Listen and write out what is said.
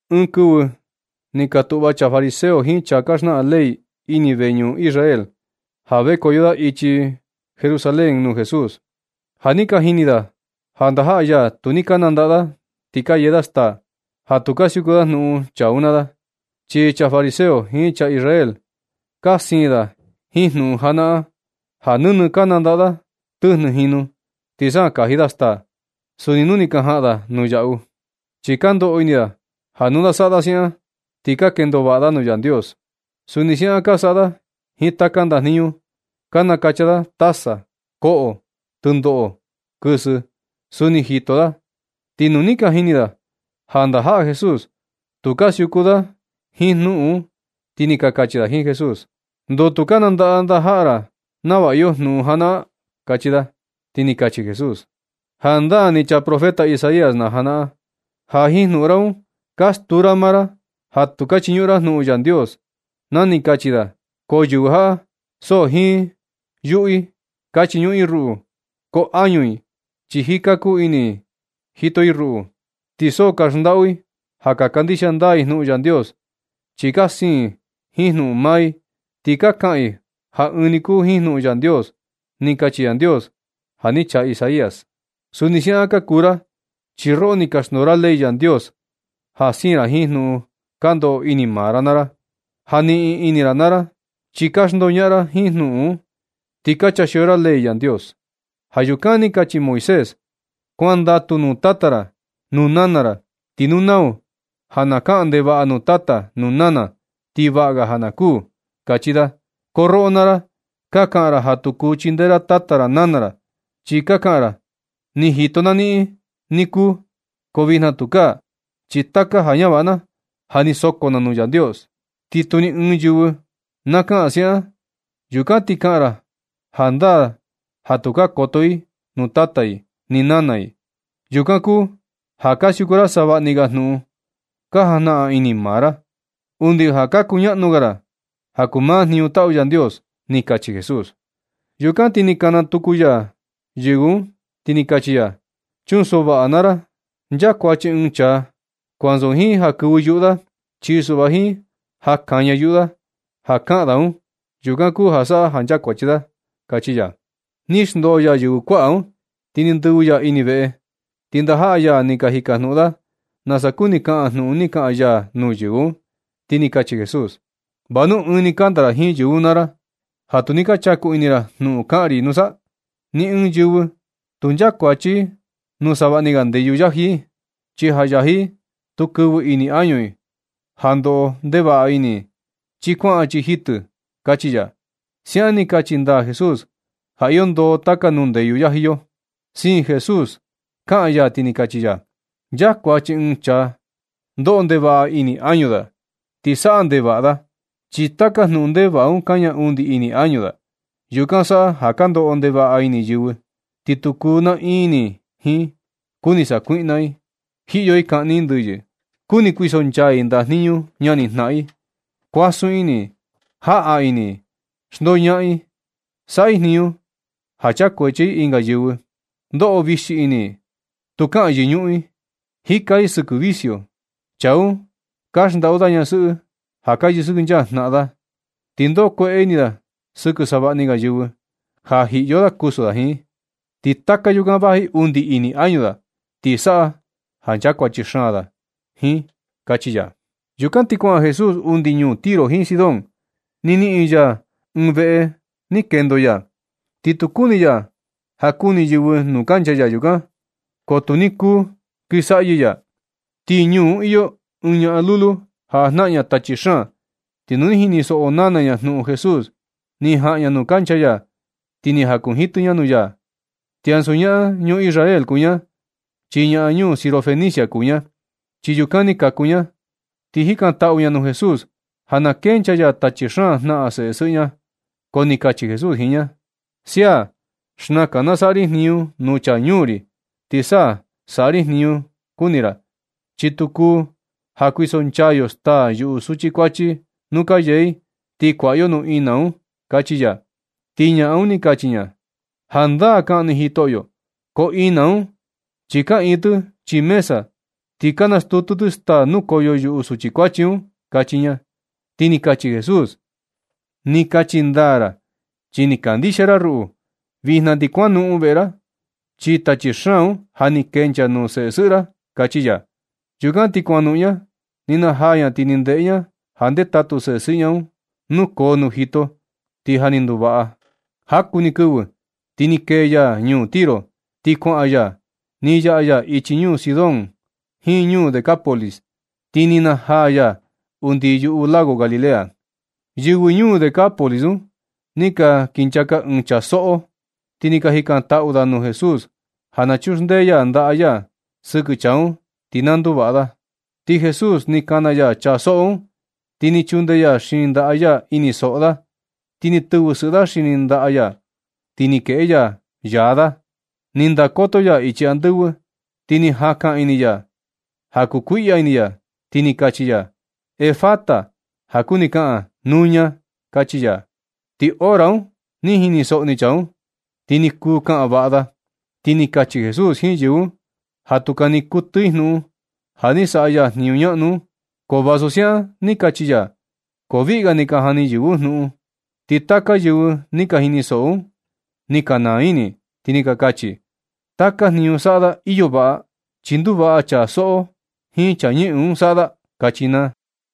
Ɨɨn kɨvɨ ni katuꞌva chaa fariseo jiin chaa ka xnaꞌan ley ini veñuꞌun Israel, ja vekoyo da ichi Jerusalén nuu Jesús. Ja ni ka jini da ja ndajaꞌa ya tu ni ka nandaꞌa da ti ka yee da staa, ja tu ka siuku da jnuꞌun chaa un naa da. Chi chaa fariseo jiin chaa Israel ka siin da jiin jnuꞌun janaꞌan, ja nɨnɨ ka nandaꞌa da tɨjnɨ jinu ti sa kaji da staa, suni nu ni ka jaꞌan da yaꞌu. Chi ka ndoꞌo ini da ja nu na saꞌa da siaꞌan, ti ka kendo vaꞌa da nuu Yandios. Suni siaꞌan ka saꞌa da jiin taka ndajniñu, ka nakacha da taza, koꞌo, tɨndoꞌo, kɨsɨ, suni jito da. Ti nu ni ka jini da ja ndajaꞌa Jesús tu ka siuku da jiin jnuꞌun un, ti ni ka kachi da jiin Jesús: ―¿Ndoo tu ka nandaꞌa ndajaꞌa ra nava iyo jnuꞌun janaꞌan? ―kachi da. Ti ni kachi Jesús: ―Jandaa ni chaa profeta Isaías na janaꞌan, ja jiin jnuꞌun ra un ka stuu ra maa ra ja tu ka chiñuꞌun ra jnuꞌun Yandios, na ni kachi da: Ko yɨvɨ jaꞌa, so jiin yuꞌu i ka chiñuꞌun i ruꞌu, ko añu i, chi jika kuu ini i jito i ruꞌu. Ti so ka xndaꞌu i ja ka kandixia ndaa i jnuꞌun Yandios, chi ka siin i jiin jnuꞌun maa i. Ti ka kaꞌan i ja ɨɨn ni kuu jiin jnuꞌun Yandios. Ni kachi Yandios ja ni chaa Isaías. Suni siaꞌan ka kuu ra, chi roꞌo ni ka xndoo ra ley Yandios ja siin ra jiin jnuꞌun ka ndoꞌo ini maa ra naa ra, ja niꞌin ini ra naa ra. Chi ka xndoñaꞌan ra jiin jnuꞌun un, ti ka chaa xio ra ley Yandios. Ja yukan ni kachi Moisés: “Kuandatu nuu tata ra nuu nana ra”, ti “Nu nau ja na kaꞌan ndevaꞌa nuu tata nuu nana, ti vaꞌa ga na kuū”, kachi da. Ko roꞌo naa ra, ka kaꞌan ra ja tu kuu chindee ra tata ra nana ra. Chi ka kaꞌan ra: “Ni jito na niꞌin ni kuu, ko vijna tukaa, chi taka ja ñavaꞌa na ja ni soko na nuu Yandios.” Ti tu ɨɨn yɨvɨ na kaꞌan siaꞌan, yukan ti kaꞌan ra jandaa ja tukaa koto i nuu tata i ni nana i. Yukan kuu ja ka siuku ra savaꞌni ga jnuꞌun ka jajnaꞌan ini maa ra, undi ja ka kuñaꞌnu ga ra ja kuu maa jniñu taꞌu Yandios ―ni kachi Jesús. Yukan ti kana tuku ya yɨvɨ un, ti ni kachi ya: ―Chunsoꞌo vaꞌa naa ra. Nchakuachi ɨɨn chaa, ko ansu jiin ja kɨvɨ yuꞌu da, chi suꞌva jiin ja kaña yuꞌu da ja kaꞌan da un. Yukan kuu ja saꞌa ja nchakuachi da ―kachi ya. Ni xndoo ya yɨvɨ kuaꞌa un, ti ni ndɨvɨ ya ini veꞌe. Ti ndajaꞌa ya ni ka jikajnuꞌun da nasa kuni kaꞌan jnuꞌun ni kaꞌan ya nuu yɨvɨ un. Ti ni kachi Jesús: ―¿Vanu ɨɨn ni kanda ra jiin yɨvɨ un naa i, ja tu ni ka chaku ini ra jnuꞌun kaꞌan ri nusa? Ni ɨɨn yɨvɨ tu nchakuachi i nuu savaꞌni ga ndeyu yaji i. Chi ja yaji i tu kɨvɨ ini añu i ja ndoꞌo ndevaꞌa ini i, chi kuaꞌan chii jitɨ i ―kachi ya. Siaꞌan ni kachi ndaa Jesús ja iyo ndoo taka nuu ndeyu yaji yo. Siin Jesús kaꞌan ya, ti ni kachi ya: ―Nchakuachi ɨɨn chaa ndoꞌo ndevaꞌa ini añu da ti saꞌa ndevaꞌa da, chi taka jnuꞌun ndevaꞌa un kaña undi ini añu da. Yukan saꞌa ja ka ndoꞌo ndevaꞌa ini yɨvɨ, ti tu kuu naꞌiin ini i jiin. Kuni sakuiꞌna i, jiꞌyo i kaꞌni i ndɨyɨ, kuni kuisonchaa i ndajniñu ñanijnaꞌan i kuasun ini i, jaꞌa ini i, xndoñaꞌan i, saꞌa i jniñu ja chakuachi i ɨnga yɨvɨ, ndoꞌo vixi ini i, tu kaꞌan yɨñuꞌun i, jika i sɨkɨ vicio, chaa un ka xndaꞌu da ñasɨꞌɨ ja ka yɨsɨkɨnchaa jnaꞌan da, ti ndoꞌo kueꞌe ini da sɨkɨ savaꞌni ga yɨvɨ ja jiꞌyo da kusu da jiin. Ti taka yukan vaji undi ini añu da, ti saꞌa ja nchakuachi xaan da jiin ―kachi ya. Yukan ti kuaꞌan Jesús undi ñuu Tiro jiin Sidón. Ni niꞌin ya ɨɨn veꞌe ni kendo ya. Ti tu kuni ya ja kuni yɨvɨ nuu kancha ya yukan, ko tu ni kuu kɨsaꞌyɨ ya. Ti ñuu un iyo ɨɨn ñaꞌan lulu ja jnaꞌan tachi xaan. Ti nu ni jinisoꞌo nana ña jnuꞌun Jesús, ni jaꞌan ña nuu kancha ya ti ni jakunjitɨ ña nuu ya. Ti ansu ñaꞌan ñuu Israel kuu ña, chi ñaꞌan ñuu Sirofenicia kuu ña, chi yukan ni kaku ña. Ti jikantaꞌu ña nuu Jesús ja na kenchaa ya tachi xaan jnaꞌan ɨɨn seꞌe sɨꞌɨ ña. Ko ni kachi Jesús jiin ña: ―Sia, xnakan na saꞌa ri jniñu nuu chaa ñuu ri, ti sa na saꞌa ri jniñu kuni ra. Chi tu kuu ja kuisonchaa yo staa yuꞌu suchi kuachi nu ka yee i, ti kuaꞌa yo nuu ina un ―kachi ya. Ti ñaꞌan un ni kachi ña: ―Jandaa kaꞌan ni Jitoꞌyo, ko ina un chi kaꞌiin tɨ chii mesa, ti nastutu tɨ staa nukoyo yuꞌu suchi kuachi un ―kachi ña. Ti ni kachi Jesús: ―Ni kachi ndaa ra chi ni kandixia ra ruꞌu. Vijna ti kuanoꞌon veꞌe ra, chi tachi xaan un ja ni kenchaa nuu sesɨꞌɨ ra ―kachi ya. Yukan ti kuanoꞌon ña. Ni najaa ña ti ni ndeꞌe ña ja ndetatu sesɨꞌɨ ña un nukoo nuu jito, ti ja ni nduvaꞌa. Jaku ni kɨvɨ ti ni kee ya ñuu Tiro, ti kuaꞌan ya. Ni yaꞌa ya ichi ñuu Sidón jiin ñuu Decápolis ti ni najaa ya undi yuꞌu lago Galilea. Yɨvɨ ñuu Decápolis un, ni ka kinchaka ɨɨn chaa soꞌó, ti ni ka jikantaꞌu da nuu Jesús ja na chuxndee ya ndaꞌa ya sɨkɨ chaa un ti na nduvaꞌa da. Ti Jesús ni kana ya chaa soꞌó un. Ti ni chundee ya xini ndaꞌa ya ini soꞌo da. Ni tɨvɨ sɨꞌɨ ya xini ndaꞌa ya. Ti ni kueꞌe ya yaá da. Ni ndakoto ya ichi andɨvɨ, ti ni jakan ini ya ja kukuiꞌya ini ya, ti ni kachi ya: ―Efata (ja kuni kaꞌan: Nuña) ―kachi ya. Ti hora un ni jinisoꞌo ni chaa un, ti ni kuu kaꞌan vaꞌa da. Ti ni kachi Jesús jiin yɨvɨ un ja tu kani kuɨtɨ i jnuꞌun ja ni saꞌa ya jniñu ñaꞌnu un. Ko vasu siaꞌan ni kachi ya, ko viꞌga ni ka jani yɨvɨ un jnuꞌun. Ti taka yɨvɨ ni ka jinisoꞌo un, ni ka naa ini i, ti ni ka kachi i: ―Taka jniñu saꞌa da iyo vaꞌa. Chi nduvaꞌa chaa soꞌó jiin chaa ñɨꞌɨn un saꞌa da ―kachi naa.